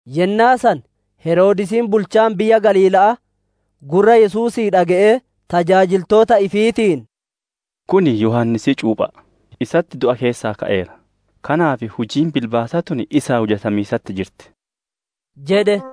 Yennaa san Heroodisiin bulchaan biyya Galiila'aa, gurra Yesuusii dhage'ee, tajaajiltoota ifiitiin, «Kun Yohaannisii cuupha'a; isatti du'a keessaa ka'eera, kanaaf hujiin bilbaasaa tun isaan hujamiisatti jirti» jedhe.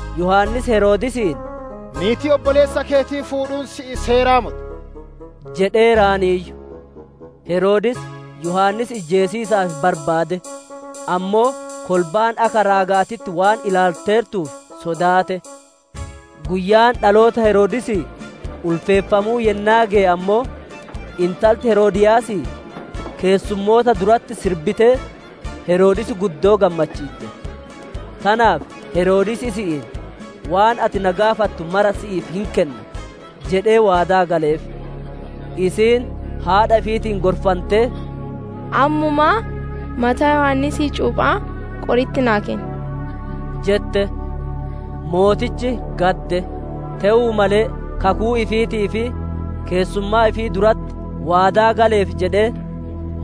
Yohaannis Heroodisiin, «Niitii obboleessa keetii fuudhuun sii seeraa moti» jedheeraayyu. Heroodis, Yohaannis ijjeesiisaaf barbaade, ammoo kolbaan akka raaga'aatitti waan ilaalteertuuf sodaate. Guyyaan dhaloota Heroodisii ulfeeffamuu yennaa geye ammoo, intalti Heroodiyaasii keessummoota duratti sirbitee, Heroodis guddoo gammachiitte. Tanaaf Heroodis isi'iin, «Waan ati na gaafattu mara si'iif hin kenna» jedhee waadaa galeef. Isiin Haadha ifiitiin gorfantee, «Ammuma mataa Yohaannisii cuupha'aa qori'itti naa kenni» jette. Mootichi gadde; te'uu malee kakuu ifiitii fi keessummaa ifii duratti waadaa galeef jedhee,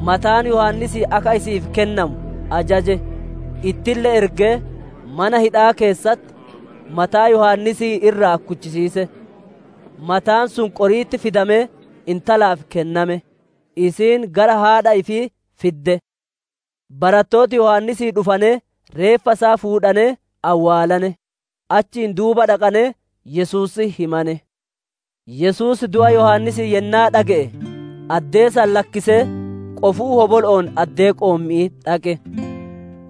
mataan Yohaannisii akka isi'iif kennamu ajaje; Ittille ergee, mana hidha'aa keessatti mataa Yohaannisii irraa kuchisiise. Mataan sun qori'itti fidamee intalaaf kenname; isiin gara haadha ifii fidde. Barattooti Yohaannisii dhufanee reeffa isaa fuudhanee awwaalane; achiin duuba dhaqanee Yesuusitti himane. Yesuus du'a Yohaannisii yennaa dhage'e, addee san lakkisee qofuu hobolo'oon addee qoommi'ii dhaqe.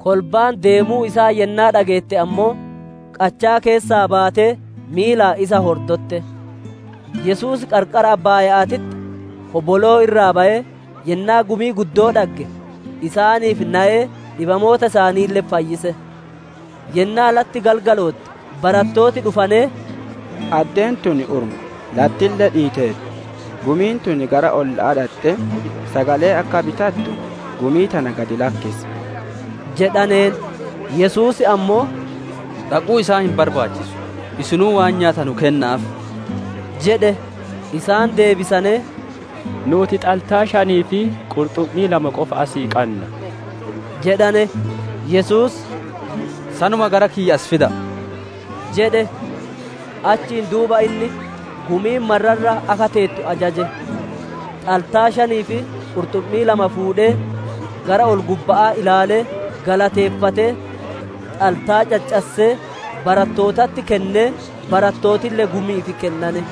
Kolbaan deemuu isaa yennaa dhageette ammoo, qachaa keessaa baatee miilaan isa hordotte. Yesuus qarqara abbaaya'aatitti hoboloo irraa bayee, yennaa gumii guddoo dhagge, isaaniif nayee dhibamoota isaaniille fayyise. Yennaa latti galgalootte, barattooti dhufanee, «Addeen tun urma, lattille dhiiteerti; gumiin tun gara ollootaa dhaxxee sagalee akka bitattu gumii tana gad lakkisi!» jedhaneen. Yesuus ammoo, «Dhaquu isaan hin barbaachisu; isinuu waan nyaatanu kenna'aaf!» jedhe. Isaan deebisanee, «Nuuti xaltaa shanii fi qurxummii lama qofa asii qanna» jedhane. Yesuus, «Sanuma gara kiyya as fida'a!» jedhe. Achiin duuba inni gumiin marra irra akka teettu ajaje. Xaltaa shanii fi qurxumii lama fuudhee, gara ol-gubba'aa ilaalee, galateeffatee xaltaa caccassee, barattootatti kennee, barattootille gumi'iif kennane.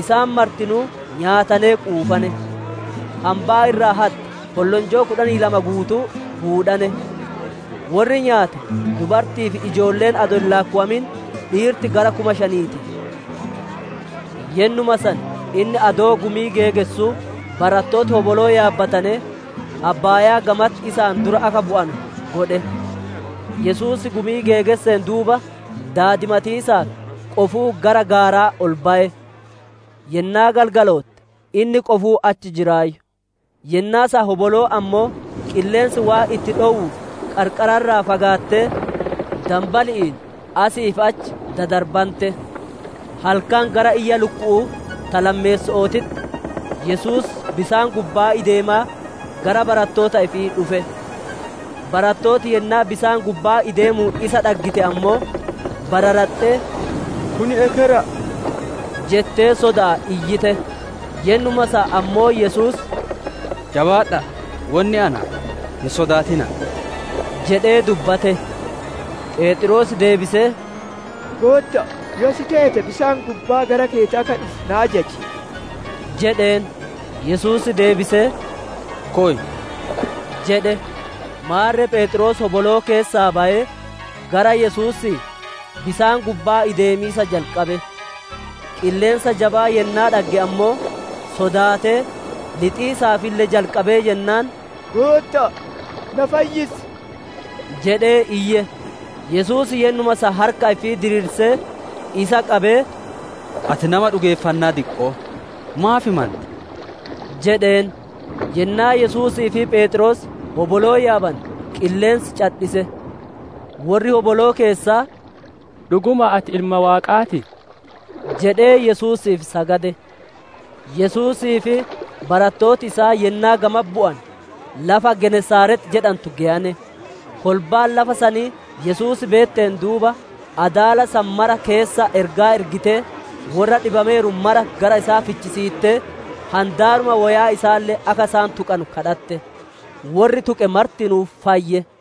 Isaan martinuu nyaatanee quufane; hambaa irraa hatte, kollonjoo kudhanii lama guutuu fuudhane. Worri nyaate dubarti'ii fi ijoolleen adoo hin laakkowamin, dhiirti gara kuma shanii ti. Yennuma san inni adoo gumii geegessuu barattooti hoboloo yaabbatanee abbaayaa gamatti isaan dura akka bu'anu godhe. Yesuus gumii geegesseen duuba, daadimatiisaaf qofuu gara gaaraa ol baye. Yennaa galgalootte, inni qofuu achi jiraayyu; yennaa san hoboloon ammoo, qilleensi waan itti dhowuuf, qarqara irraa fagaattee, danbali'iin asii fi achi dadarbante. Halkan gara iyya lukku'uu ta lammeesso'ootitti Yesuus bisaan gubbaa ideemaa gara barattoota ifii dhufe. Barattooti yennaa bisaan gubbaa ideemuun isa dhaggite ammoo, bararaxxee, «Kun ekera'a» jettee soda'aan iyyite. Yennuma san ammoo Yesuus, «Jabaadha'a! Wonni anaa, hin sodaatina'a!» jedhee dubbate. Pheexroos deebisee, «Gootta'a, yoo si teete, bisaan gubbaa gara keeti akka dhufu na ajaji» jedheen. Yesuus deebisee, «Koy!» jedhe. Maarre Pheexroos hoboloo keessaa bayee, gara Yesuusii, bisaan gubbaa ideemiisa jalqabe. Qilleensa jabaa yennaa dhagge ammoo, sodaatee, lixiisaafille jalqabee jennaan, «Gootta'a, na fayyisi!» jedhee iyye. Yesuus yennuma san harka ifii diriirsee, isa qabee, «Ati nama dhugeeffannaa diqqo'oo! Maaf mante?» jedheen. Yennaa Yesuusii fi Pheexroos hoboloo yaabane, qilleensi cadhise. Worri hoboloo keessaa, «Dhugumaan ati Ilma Waaqaa ti» jedhee Yesuusiif sagade. Yesuusii fi barattooti isaa yennaa gamatti bu'ane, lafa Genesaarex jedhantu geyane. Kolbaan lafa sanii Yesuus beetteen duuba, adaala san mara keessa ergaa ergitee worra dhibameeru mara gara isaa fichisiittee, handaaruma woyaa isaalle akka isaan tuqanu kadhatte; worri tuqe martinuu fayye.